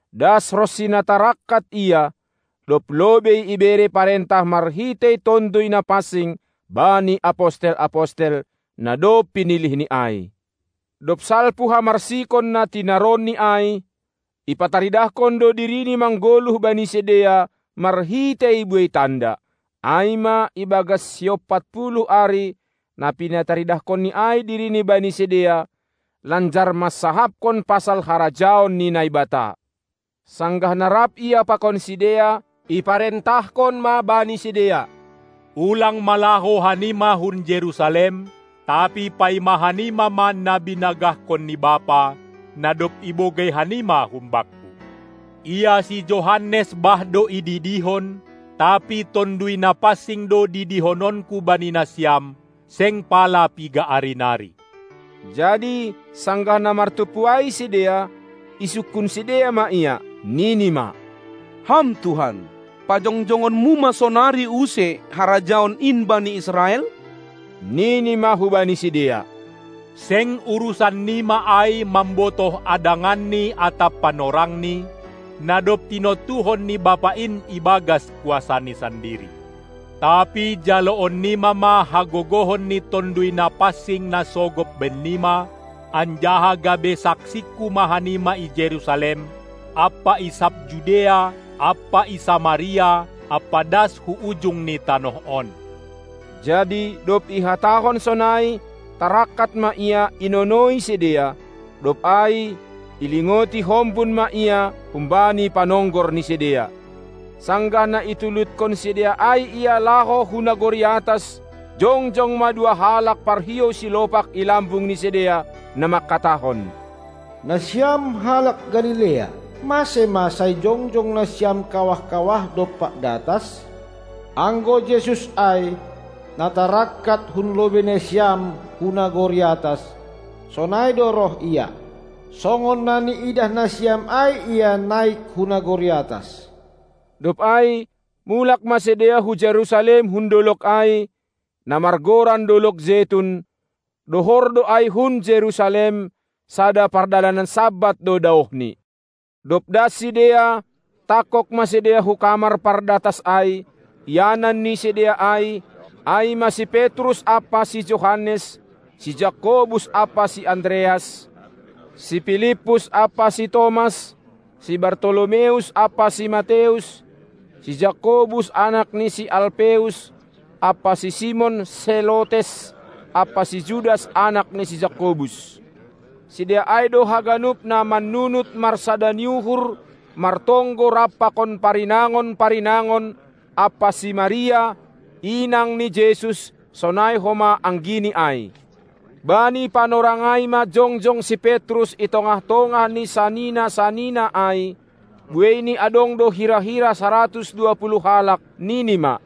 das ronsi na tarangkat Ia, dob lobei ibere parentah marhitei Tonduy Napansing bani apostel-apostel, na dob pinilihNi ai. Dob salpu hamarsikon na tinaronNi ai, ipataridahkon do diriNi manggoluh bani sidea marhitei buei tanda, ai ma ibagas siompatpuluh ari na pinataridahkonNi ai diriNi bani sidea, lanjar mansahapkon pasal harajaon ni Naibata. Sanggah na rap Ia pakon sidea, iparentahkon ma bani sidea: Ulang ma laho hanima hun Jerusalem, tapi paima hanima ma na binagahkon ni Bapa, na dob ibogei hanima hum Bakku. Ia si Johannes bah do ididihon, tapi Tonduy Napansing do didihononKu bani nasiam, seng pala piga ari nari. Jadi sanggah na martumpu ai sidea, isungkun sidea ma Ia, nini ma: Ham Tuhan, pajongjongonMu ma sonari use harajaon in bani Israel? Nini ma hubani sidea: Seng urusan nima ai, mambotoh adanganni atap panorangni, na dob tinontuhon ni Bapa in ibagas kuasaNi sandiri. Tapi jaloon nima ma hagogohon ni Tonduy Napansing na sogop bennima, anjaha gabe saksingKu ma hanima i Jerusalem ampa i sab Judea ampa i Samaria ampa das hu ujung ni tanoh on. Jadi dob ihatahon sonai, tarangkat ma Ia inonoi sidea, dob ai ilingodi hombun ma Ia humbani panonggor ni sidea. Sanggah na ituludkon sidea ai Ia laho hu nagori atas, jongjong ma dua halak parhiou silopak i lambung ni sidea, na mangkatahon: Nasiam halak Galilea, mase ma sai jongjong nasiam kawah-kawah dompak datas? Anggo Jesus ai, na tarangkat hun lobei nasiam hu nagori atas, sonai do roh Ia, songon na niidah nasiam ai Ia naik hu nagori atas. Dob ai mulak ma sidea hu Jerusalem hun dolog ai, na margoran dolog Jetun; dohor do ai hun Jerusalem, sada pardalanan Sabat do daohni. Dob das sidea, tangkog ma sidea hu kamar pardatas ai, ianan ni sidea ai, ai ma si Petrus ampa si Johannes, si Jakobus ampa si Andreas, si Pilippus ampa si Tomas, si Bartolomeus ampa si Mateus, si Jakobus anak ni si Alpeus, ampa si Simon Selotes, ampa si Judas anak ni si Jakobus. Sidea ai do haganup na mannunut marsada ni uhur martonggo rap pakon parinangon-parinangon ampa si Maria, inang ni Jesus, sonai homa anggiNi ai. Bani panorang ai ma jongjong si Petrus i tongah-tongah ni sanina-sanina ai, bueini adong do hira-hira saratus dua puluh halak, nini ma: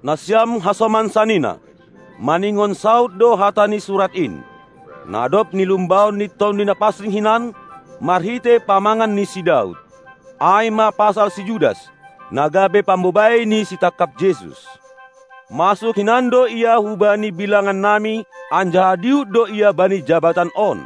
Nasiam hasoman sanina, maningon saud do hata ni Surat in, na dob nilumbahon ni Tonduy Napansing hinan marhitei pamangan ni si Daud, ai ma pasal si Judas, na gabe pambobai ni sitangkap Jesus. Masuk hinan do ia hubani bilangannami, anjaha dihut do ia bani jabatan on.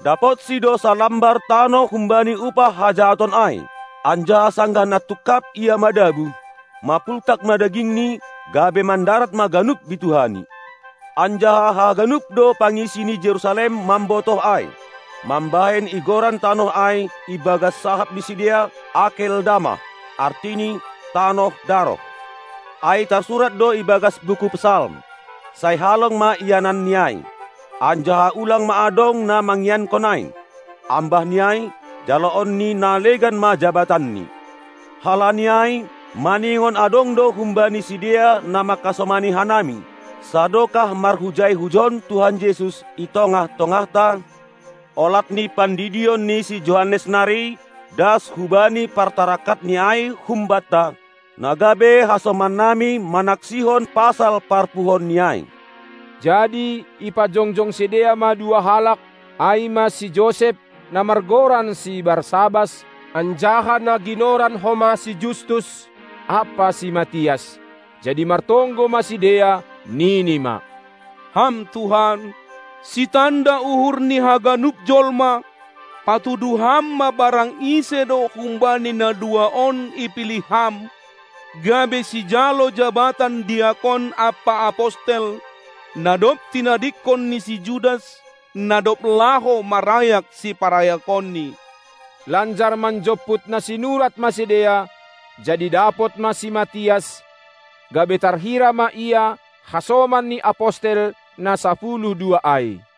Dapotsi do sanlambar tanoh humbani upah hajahaton ai; anjaha sanggah na tungkap ia madabuh, mapultak ma dagingni, gabe mandarat ma ganup bituhani. Anjaha haganup do pangisi ni Jerusalem mambotoh ai, mambahen igoran tanoh ai ibagas sahap ni sidea: Akeldamah, artini: tanoh daroh. Ai tarsurat do i bagas buku Psalm: Sai halong ma iananni ai, anjaha ulang ma adong na mangiankon ai! Ambah ni ai: Jaloon ni na legan ma jabatanni! Halani ai maningon adong do humbani sidea na mangkasomani hanami, sadokah marhujai-hujon Tuhan Jesus i tongah-tongahta, olat ni pandidion ni si Johannes nari das hubani partarangkatNi ai humbanta, na gabe hasoman nami manaksihon pasal parpuhoonNi ai. Jadi ipajongjong sidea ma dua halak, ai ma si Josep, na margoran si Barsabas anjaha na ginoran homa si Justus, ampa si Matias. Jadi martonggo ma sidea, nini ma: Ham Tuhan, sitanda uhur ni haganup jolma, patuduh Ham ma barang ise do humbani na dua on ipilih Ham, gabe sijalo jabatan diakon ampa apostel, na dob tinadingkon ni si Judas, na dob laho marayak siparayakonni. Lanjar manjomput na sinurat ma sidea, jadi dapot ma si Matias, gabe tarhira ma ia hasoman ni apostel na sapuluh dua ai.